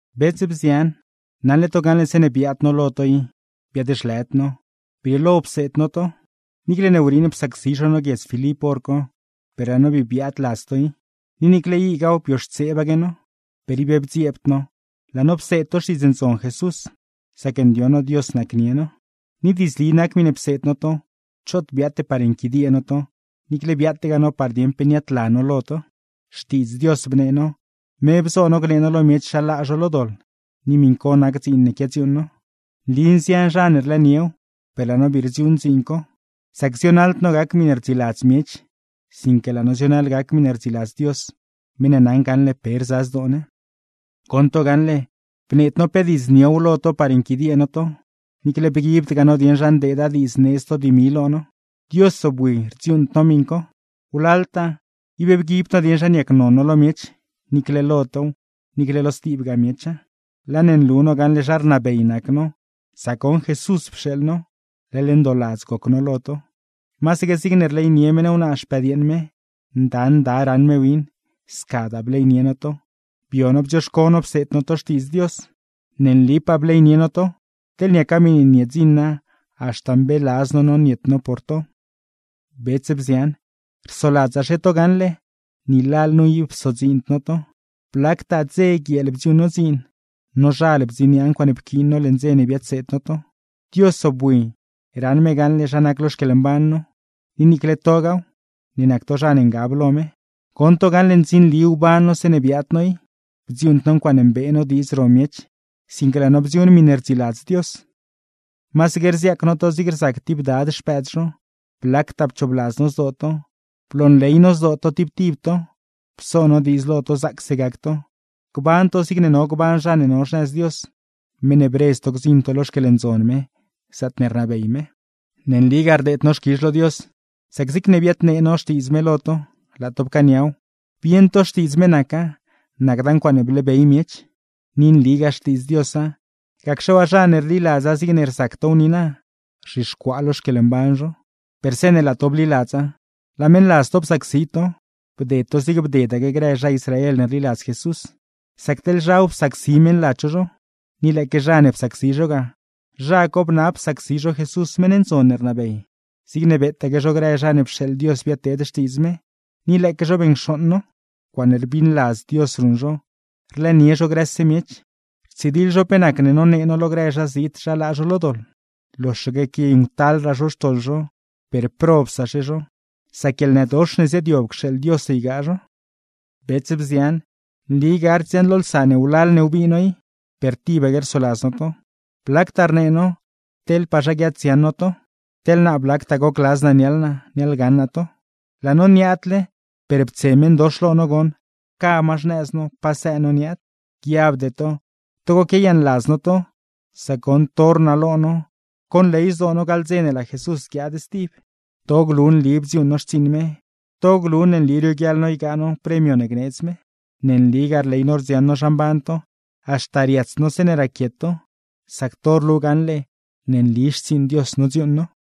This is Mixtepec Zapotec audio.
Bets, bzian, naṉle to gaṉle zeeṉe biaad no lo to i biaad-zhlëd no, brieelo pseed no to. Niicle ne wriiṉ psacsi zho no guiedz Filip hor co, per laa no bii biaad ladz to i, ni niicle igaaw bioxtseebaque no, per ib bdziebd no laa no pseed to Xtiidz Ndzon Jesús; sac ndioṉ no Dios nacnie no. Ni diidzli nac miṉe pseed no to, choot biaate par nquidiee no to, niicle biaategaa no par dieṉ pe niaadla no lo to. Xtiidz Dios bnee no, me bzo no gnee no lo miech zha laa zho lo doḻ, ni miṉ co nac dziin ne quiadziuuṉ no. Nli nzian zha ne rlëëniew, per laa no bii rdziuuṉ dziin co; sac zionaḻd no gac miṉe rdziladz miech, sinque laa no zionaḻ gac miṉe rdziladz Dios, meṉ ne naṉ gaṉle pe rza zdoo ne. Goṉ to gaṉle, bneed no pe diidz niow lo to par nquidiee no to, niicle bguibdgaa no dieṉ zha ndeeda diidz needz to dimi lo no. Dios zobwi rdziuuṉd no miṉ co. Wlaltaa ib bguibd no dieṉ zha niacnon no lo miech, niicle lo tow, niicle lo stibgaa miecha. Laa ne nlu no gaṉle zha rnabey nac no, sac goṉ Jesús pxeeḻ no, leḻ ndooladz goc no lo to. Masaque zigne rleynie meṉ wnaa xpëdyeeṉ me, nda nda raṉ me win; scadaa bleynie no to, bio no bdzioxco no pseed no to Xtiidz Dios. Ne nlipaa bleynie no to, teḻne niaca miṉe niedziṉa haxta mbeeladz no no niet no por to. Bets, bzian, rsoladzaxe to gaṉle ni lalnu ib psodziind no to; blactaa, dze guieel bdziuuṉ no dziin, nozhal bdziniaa ncuaaṉe pquiin no leṉ dze ne biadseed no to. Dios zobwi raṉ me gaṉle zha nac lo xquieḻmban no, ni niicle togaaw (ne nac to zha ne ngab lo me) goṉ to gaṉle ndzinli wban no zeeṉe biaad no i, bdziuuṉd no ncuaaṉe mbee no diidz ro miech, sinque laa no bdziuuṉ miṉe rdziladz Dios. Masaque rziaac no to zig rzac tib dad xpëëd zho, blactaa pchoobladz no zdoo to, bloonley no zdoo to tib tib to; pso no diidz lo to zaacse gac to, gban to zigne no gban zha ne no xnëz Dios, meṉ ne bredz to gdziṉ to lo xquieḻndzon me, zaatne rnabey me. Ne nligaa rdeed no xquizh lo Dios, sac zigne biadnee no Xtiidz me lo to, laa to pcaaniaw, bieṉ to Xtiidz me naca, nacda ncuaaṉe bleebey miech. Ni nligaa Xtiidz Diosa, gacxe waa zha ne rliladza zigne rzac tow niina, rzhixcuaa lo xquieḻmban zho. Per zeeṉe laa to bliladza, laa meṉladz to psacsi to; bded to zigne bdedaque grë zha Israel ne rliladz Jesús, sac teḻ zhaw psacsi meṉladz zho zho. Ni lëëque zha ne psacsi zho ga, zha co bnab psacsi zho Jesús meṉ ndzon ne rnabey, zigne beetaque zho grë zha ne pxeeḻ Dios biadteed Xtiidz me; ni lëëque zho beṉcxooṉ no. Ncuaaṉe rbiṉladz Dios ruṉ zho, rlëënie zho grëse miech, rtsidiḻ zho pe nacne nonee no lo grë zhazit zha laa zho lo doḻ. Loxaque quiayuṉctalraa zho xtoḻ zho, per, ¡probsaxe zho, sac guieḻnëdox ne ziaadyob cxeeḻ Dios ygaa zho! Bets, bzian, nli gard dziaṉlolsa ne wlal ne wbii no i, per tibaque rsoladz no to; blactaa rnee no teḻpaa zha guiaaddziaṉ no to. Teḻ naa blactaa gocladz naa niaḻ naa, niaḻgaṉ naa to. Laa no niaadle, per ptse meṉdox lo no goṉ, pca ma xnëz no pasëë no niaad. Guiabde to togo quiayaaṉladz no to, sac goṉ to rnalo no conley zdoo no gaḻ dze ne laa Jesús guiaad stib. To glu nli bdziuuṉ no xtsiiṉ me, to glu ne nli rioguiaḻ no ygaa no premio ne gneedz me. Ne nligaa rley no rdziaṉ no zha mban to, haxta riats no zeeṉe raquiet to; sac to rlu gaṉle ne nli xtsiiṉ Dios nodziuuṉ no.